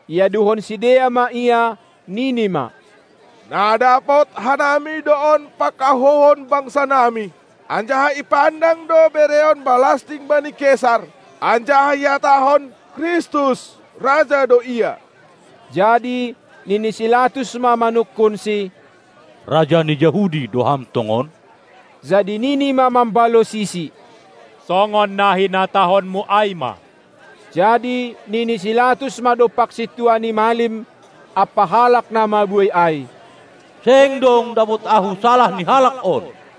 Iaduhon sidea ma Ia, nini ma: Na dapot hanami do on pakahouhon bangsanami, anjaha ipandang do bereon balasting bani Kesar, anjaha ihatahon, Kristus, Raja do Ia. Jadi nini si Latus ma manungkunSi: Raja ni Jahudi do Ham tongon? Jadi nini ma mambalosisi: Songon na hinatahonmu ai ma! Jadi nini si Latus ma dompak sintua ni malim ampa halak na mabuei ai: Seng dong dapot ahu salah ni Halak on.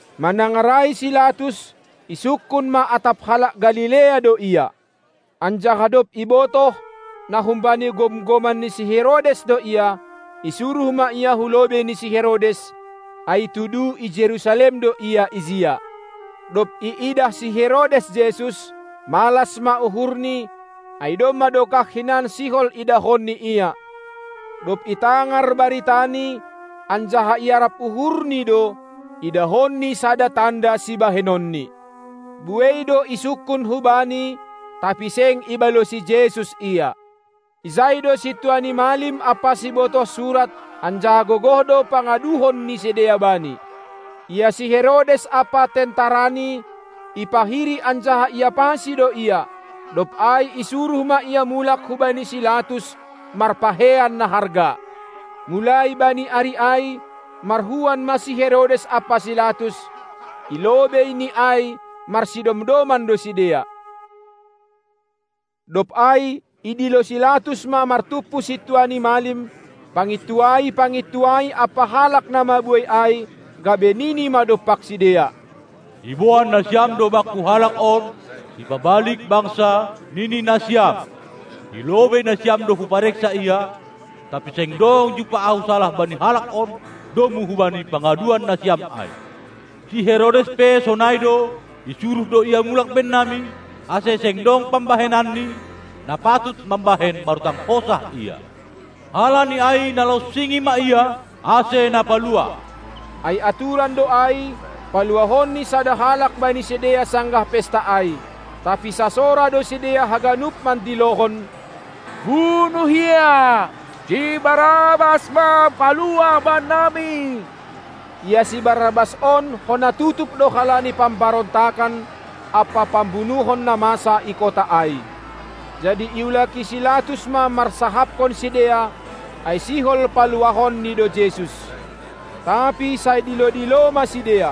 Manangar ai si Latus, isungkun ma atap halak Galilea do Ia. Anjaha dob ibotoh, na humbani gomgoman ni si Herodes do Ia, isuruh ma Ia hulobei ni si Herodes, ai tudu i Jerusalem do ia ijia. Dob iidah si Herodes Jesus, malas ma uhurni, ai domma dokah hinan sihol idahonni Ia, dob itangar baritani, anjaha iarap uhurni do, idahonni sada tanda sibahenonNi. Buei do isungkun hu Bani, tapi seng ibalosi Jesus ia. Ijai do sintua ni malim ampa sibotoh surat, anjaha gogoh do pangaduhon ni sidea Bani. Ia si Herodes ampa tentarani, ipahiri anjaha iapasi do Ia, dob ai isuruh ma Ia mulak hubani si Latus marpakeian na harga. Mulai bani ari ai marhuan ma si Herodes ampa si Latus, i lobei ni ai marsidomdoman do sidea. Dob ai idilo si Latus ma martumpu sintua ni malim, pangintuai-pangintuai ampa halak na mabuei ai, gabe nini ma dompak sidea: Iboan nasiam do bakku Halak on, sipabalik bangsa, nini nasiam. I lobei nasiam do hupareksa Ia, tapi seng dong jumpah ahu salah bani Halak on, domu hubani pangaduan nasiam ai. Si Herodes pe sonai do, isuruh do Ia mulak bennami, ase seng dong pambahenanni, na patut mambahen marutang hosah Ia. Halani ai nalonsingi ma Ia, ase napaluah. Ai aturan do ai, paluahonni sada halak bani sidea sanggah pesta ai. Tapi sasora do sidea haganup mandilohon: Bunuh Ia! Si Barrabas ma paluah bannami! Ia si Barrabas on hona tutup do halani pambarontakan ampa pambunuhon na masa i kota ai. Jadi iulaki si Latus ma marsahapkon sidea, ai sihol paluahonni do Jesus. Tapi sai dilo-dilo ma sidea: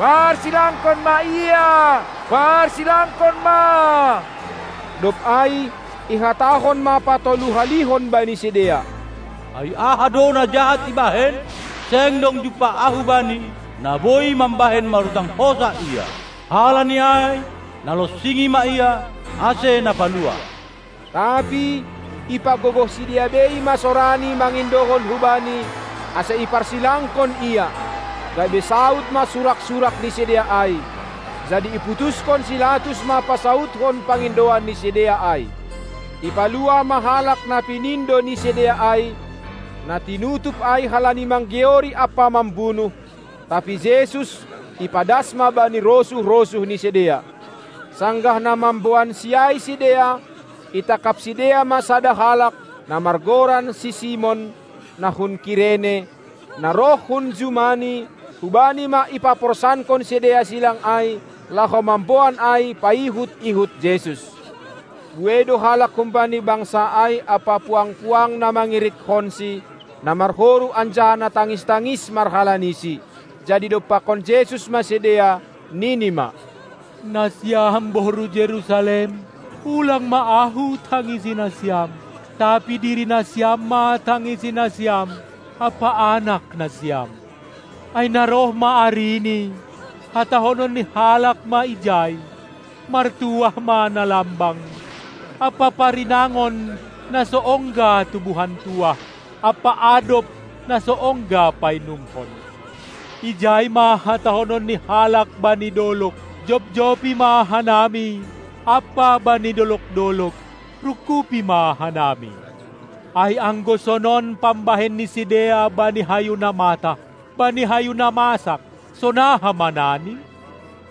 Parsilangkon ma Ia, parsilangkon ma! Dob ai ihatahon ma patolu-halihon bani sidea: Ai aha do na jahat ibahen? Seng dong jumpah ahu Bani na boi mambahen marutang hosah Ia. Halani ai nalonsingi ma Ia, ase napaluah. Tapi ipagogoh sidea bei ma sorani mangindohon hubani, ase iparsilangkon Ia, gabe saud ma surak-surak ni sidea ai. Jadi iputushon si Latus ma pasaudkon pangindoan ni sidea ai. Ipaluah ma halak na pinindo ni sidea ai, na tinutup ai halani manggeori ampa mambunuh, tapi Jesus ipadas ma bani rosuh-rosuh ni sidea. Sanggah na mamboanSi ai sidea, itangkap sidea ma sada halak, na margoran si Simon, na hun Kirene, na roh hun jumani; hubani ma ipaporsankon sidea silang ai, laho mamboan ai paihut-ihut Jesus. Buei do halak humbani bangsa ai ampa puang-puang na mangirikkonsi, na marhoru anjaha na tangis-tangis marhalanisi. Jadi idompakkon Jesus ma sidea, Nini ma: Nasiam boru Jerusalem, ulang ma Ahu tangisi nasiam, tapi diri nasiam ma tangisi nasiam ampa anak nasiam! Ai na roh ma arini, hatahonon ni halak ma ijai: Martuah ma na lambang, ampa parinangon na so ongga tubuhan tuah, ampa adop na so ongga painumhon! Ijai ma hatahonon ni halak bani dolog: "Jobjobi ma hanami!" ampa bani dolog-dolog: "Rungkubi ma hanami!" Ai anggo sonon pambahen ni sidea bani hayu na matah, bani hayu na masak, sonaha ma nani?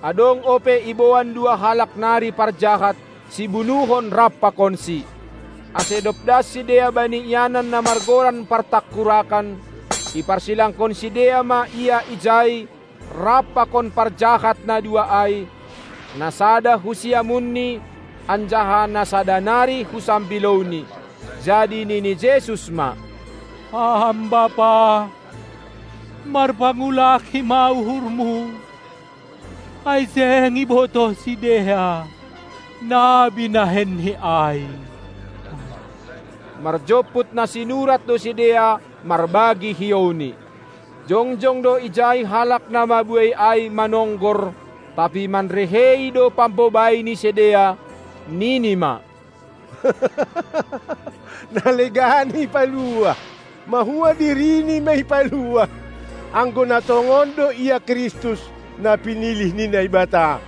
Adong ope iboan dua halak nari parjahat, sibunuhon rap pakonSi. Ase dob das sidea bani ianan na margoran partangkurakan, iparsilangkon sidea ma Ia ijai rap pakon parjahat na dua ai, na sada hu siamunNi anjaha na sada nari hu sambilouNi. Jadi nini Jesus ma: Ham Bapa, marpangulaki ma uhurMu, ai seng ibotoh sidea na binahenni ai! Marjomput na sinurat do sidea marbagi hiouNi. Jongjong do ijai halak na mabuei ai manonggor, tapi manrehei do pambobai ni sidea, nini ma: Na legan ipaluah, mahua dirini ma ipaluah, anggo na tongon do Ia Kristus, na pinilih ni Naibata!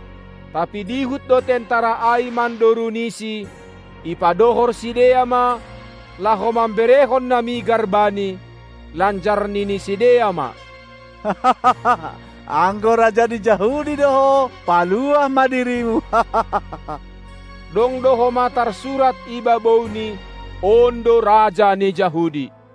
Tapi dihut do tentara ai mandoruniSi, ipadohor sidea ma, laho mamberehon na migar Bani, lanjar nini sidea ma: Anggo raja ni Jahudi do Ho, paluah ma dirimu! Dong do homa tarsurat i babouNi: On do raja ni Jahudi.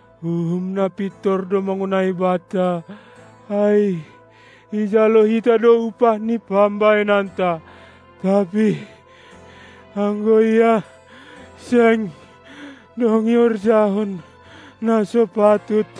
Uhum na pintor do mangonai banta, ai ijalo hita do upah ni pambahenanta. Tapi anggo Ia, seng dong ihorjahon na so patut.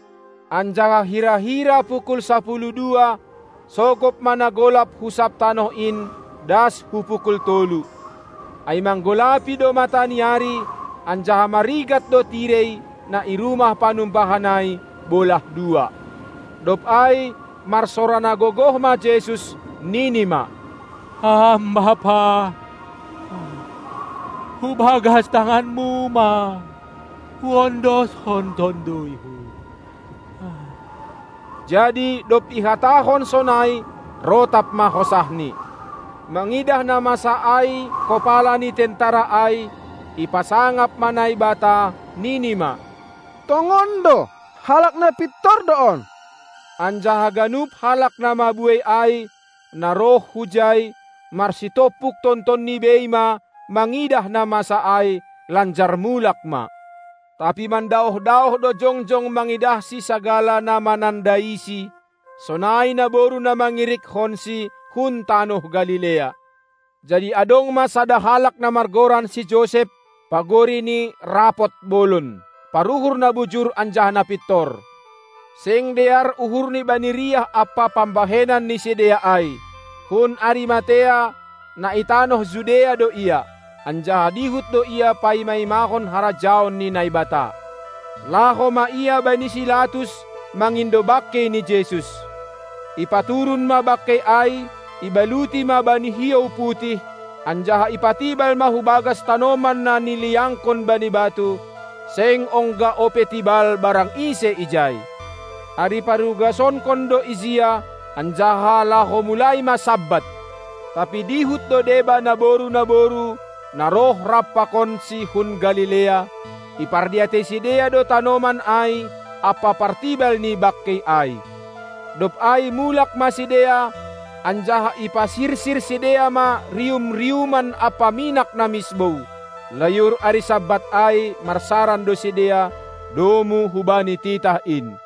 Anjaha hira-hira pukul sapuluh dua, sogop ma na golap hu sab tanoh in das hu pukul tolu. Ai manggolapi do mata ni ari, anjaha marigat do tirei, na i rumah panumbahan ai, bolah dua. Dob ai marsora na gogoh ma Jesus, nini ma: Ham Bapa! Hubagas tanganMu ma Huondoshon tonduyHu. Jadi dob ihatahon sonai, rotap ma hosahNi. Mangidah na masa ai kopala ni tentara ai, ipasangap ma Naibata, nini ma: Tongon do, halak na pintor do on! Anjaha ganup halak na mabuei ai, na roh hujai, marsitompuk tontonni bei ma mangidah na masa ai, lanjar mulak ma. Tapi mandaoh-daoh do jongjong mangidahSi sagala na manandaiSi, sonai naboru na mangirikkonSi hun tanoh Galilea. Jadi adong ma sada halak na margoran si Josep, pagori ni rapot bolon, paruhur na bujur anjaha na pintor. Seng dear uhurni bani riah ampa pambahenan ni sidea ai. Hun Arimatea, na i tanoh Judea do ia, anjaha dihut do ia paima-imahon harajaon ni Naibata. Laho ma ia bani si Latus mangindo bangkei ni Jesus. Ipaturun ma bangkei ai, ibaluti ma bani hiou putih, anjaha ipatibal ma hubagas tanoman na niliangkon bani batu, seng ongga ope tibal barang ise ijai. Ari parugasonkon do ijia, anjaha laho mulai ma Sabat. Tapi dihut do deba naboru-naboru, na roh rap pakonsi hun Galilea; ipardiatei sidea do tanoman ai ampa partibal ni bangkei ai. Dob ai mulak ma sidea, anjaha ipasirsir sidea ma rium-riuman ampa minak na misbou. Layur ari Sabat ai marsaran do sidea, domu hubani titah in.